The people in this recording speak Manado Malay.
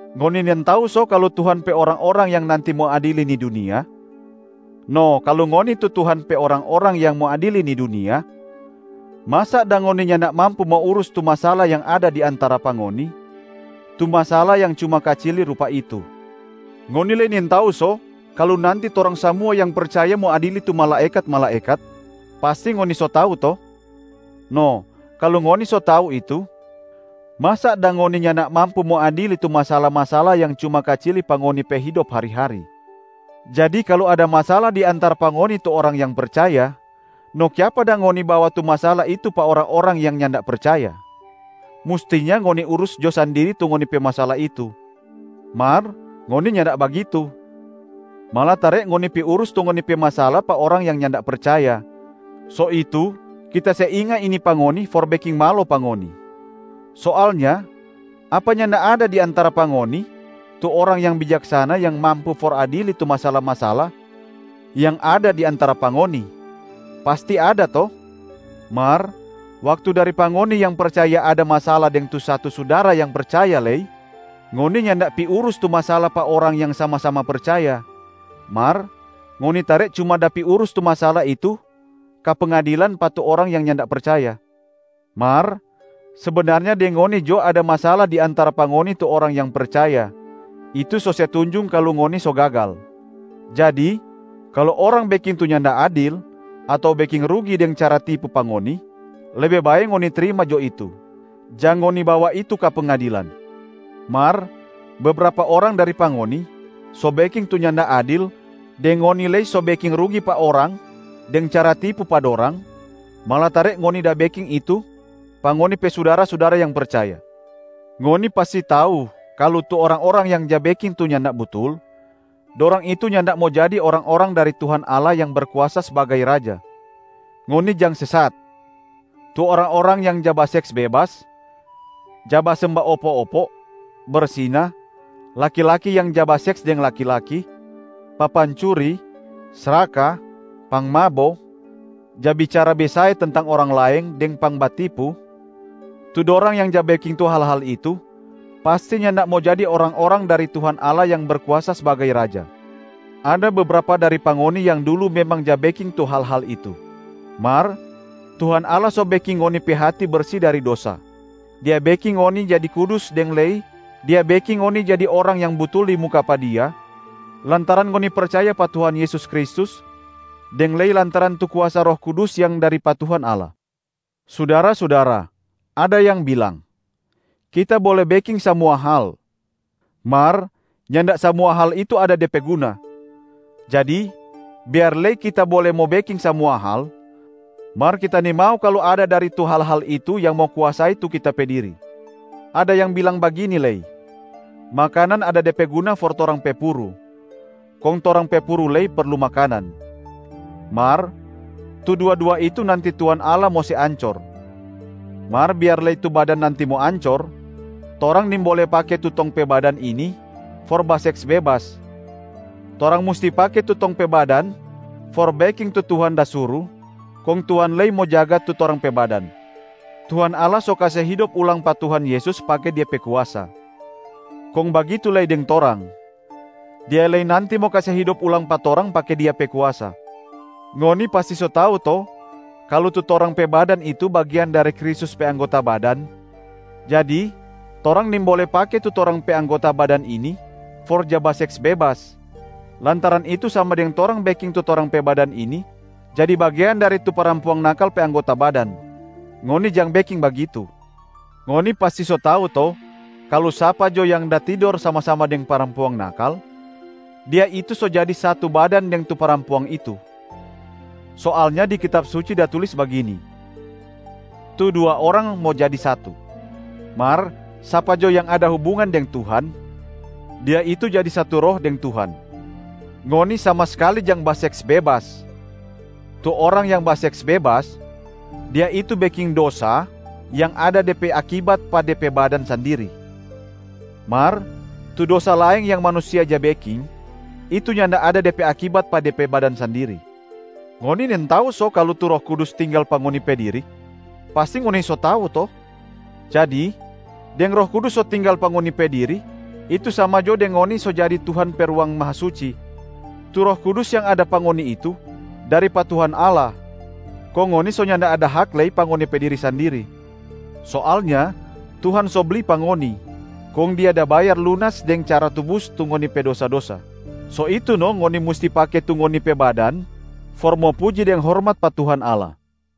Ngoni nintau so kalu Tuhan pe orang-orang yang nanti mo adili ni dunia? No kalu ngoni tu Tuhan pe orang-orang yang mo adili ni dunia, masa dang ngoni nyanda mampu mo urus tu masala yang ada di antara pa ngoni, tu masala yang cuma kacili rupa itu. Ngoni lei nintau so kalu nanti torang samua yang percaya mo adili tu malaekat-malaekat? Pasti ngoni so tau to? No kalu ngoni so tau itu, masa dang ngoni nyanda mampu mo adili tu masala-masala yang cuma kacili pa ngoni pe hidop hari-hari. Jadi kalu ada masala di antara pa ngoni tu orang yang percaya, no kiapa dang ngoni bawa tu masala itu pa orang-orang yang nyanda percaya? Mustinya ngoni urus jo sandiri tu ngoni pe masala itu. Mar ngoni nyanda bagitu, malatare ngoni pi urus tu ngoni pe masala pa orang yang nyanda percaya, so itu kita se inga ini pa ngoni for beking malo pa ngoni. Soalnya apa nyanda ada di antara pa ngoni tu orang yang bijaksana yang mampu for adili tu masala-masala yang ada di antara pa ngoni? Pasti ada to? Mar waktu dari pa ngoni yang percaya ada masala deng tu satu sudara yang percaya lei, ngoni nyanda pi urus tu masala pa orang yang sama-sama percaya, mar ngoni tare cuma da pi urus tu masala itu ka pengadilan pa tu orang yang nyanda percaya. Mar sebenarnya deng ngoni jo ada masala di antara pa ngoni tu orang yang percaya, itu so se tunjung kalu ngoni so gagal. Jadi kalu orang beking tu nyanda adil ato beking rugi deng cara tipu pa ngoni, lebe bae ngoni trima jo itu, jang ngoni bawa itu ka pengadilan. Mar bebrapa orang dari pa ngoni so beking tu nyanda adil deng ngoni lei so beking rugi pa orang deng cara tipu pa dorang, malatare ngoni da beking itu pa ngoni pe sudara-sudara yang percaya. Ngoni pasti so tau kalu tu orang-orang yang ja beking tu nyanda butul, dorang itu nyanda mo jadi orang-orang dari Tuhan Allah yang Berkuasa sbagai Raja. Ngoni jang sesat! Tu orang-orang yang ja baseks bebas, ja basemba opo-opo, bersina, laki-laki yang ja baseks deng laki-laki, papancuri, sraka, pangmabo, ja bicara besae tentang orang laeng deng pangbatipu, tu dorang yang ja beking tu hal-hal itu pasti nyanda mo jadi orang-orang dari Tuhan Allah yang Berkuasa sbagai Raja. Ada bebrapa dari pa ngoni yang dulu memang ja beking tu hal-hal itu. Mar Tuhan Allah so beking ngoni pe hati bersi dari dosa, Dia beking ngoni jadi kudus deng lei Dia beking ngoni jadi orang yang butul di muka pa Dia lantaran ngoni percaya pa Tuhan Yesus Kristus deng lei lantaran tu kuasa Roh Kudus yang dari pa Tuhan Allah. Sudara-sudara, ada yang bilang, “Kita bole beking samua hal,” mar nyanda samua hal itu ada de pe guna. Jadi biar lei kita bole mo beking samua hal, mar kita nimau kalu ada dari tu hal-hal itu yang mo kuasai tu kita pe diri. Ada yang bilang bagini lei, “Makanan ada de pe guna for torang pe puru, kong torang pe puru lei perlu makanan,” mar tu dua-dua itu nanti Tuhan Allah mo se ancor. Mar biar lei tu badan nanti mo ancor, torang nimbole pake tu tong pe badan ini for baseks bebas. Torang musti pake tu tong pe badan for beking tu Tuhan da suru, kong Tuhan lei mo jaga tu torang pe badan. Tuhan Allah so kase hidop ulang pa Tuhan Yesus pake Dia pe kuasa. Kong bagitu lei deng torang, Dia lei nanti mo kase hidop ulang pa torang pake Dia pe kuasa. Ngoni pasti so tau to kalu tu torang pe badan itu bagean dari Kristus pe anggota badan? Jadi torang nimbole pake tu torang pe anggota badan ini for ja baseks bebas, lantaran itu sama deng torang beking tu torang pe badan ini jadi bagean dari tu parampuang nakal pe anggota badan. Ngoni jang beking bagitu! Ngoni pasti so tau to kalu sapa jo yang da tidor sama-sama deng parampuang nakal, dia itu so jadi satu badan deng tu parampuang itu. Soalnya di Kitab Suci da tulis bagini, “Tu dua orang mo jadi satu.” Mar sapa jo yang ada hubungan deng Tuhan, dia itu jadi satu roh deng Tuhan. Ngoni sama skali jang baseks bebas! Tu orang yang baseks bebas, dia itu beking dosa yang ada de pe akibat pa de pe badan sandiri. Mar tu dosa laeng yang manusia ja beking, itu nyanda ada de pe akibat pa de pe badan sandiri. Ngoni nintau so kalu tu Roh Kudus tinggal pa ngoni pe diri? Pasti ngoni so tau to? Jadi deng Roh Kudus so tinggal pa ngoni pe diri, itu sama jo deng ngoni so jadi Tuhan pe Ruang Mahasucia. Tu Roh Kudus yang ada pa ngoni itu dari pa Tuhan Allah, kong ngoni so nyanda ada hak lei pa ngoni pe diri sandiri. Soalnya Tuhan so bli pa ngoni, kong Dia da bayar lunas deng cara tubus tu ngoni pe dosa-dosa. So itu no ngoni musti pake tu ngoni pe badan for mo puji deng hormat pa Tuhan Allah.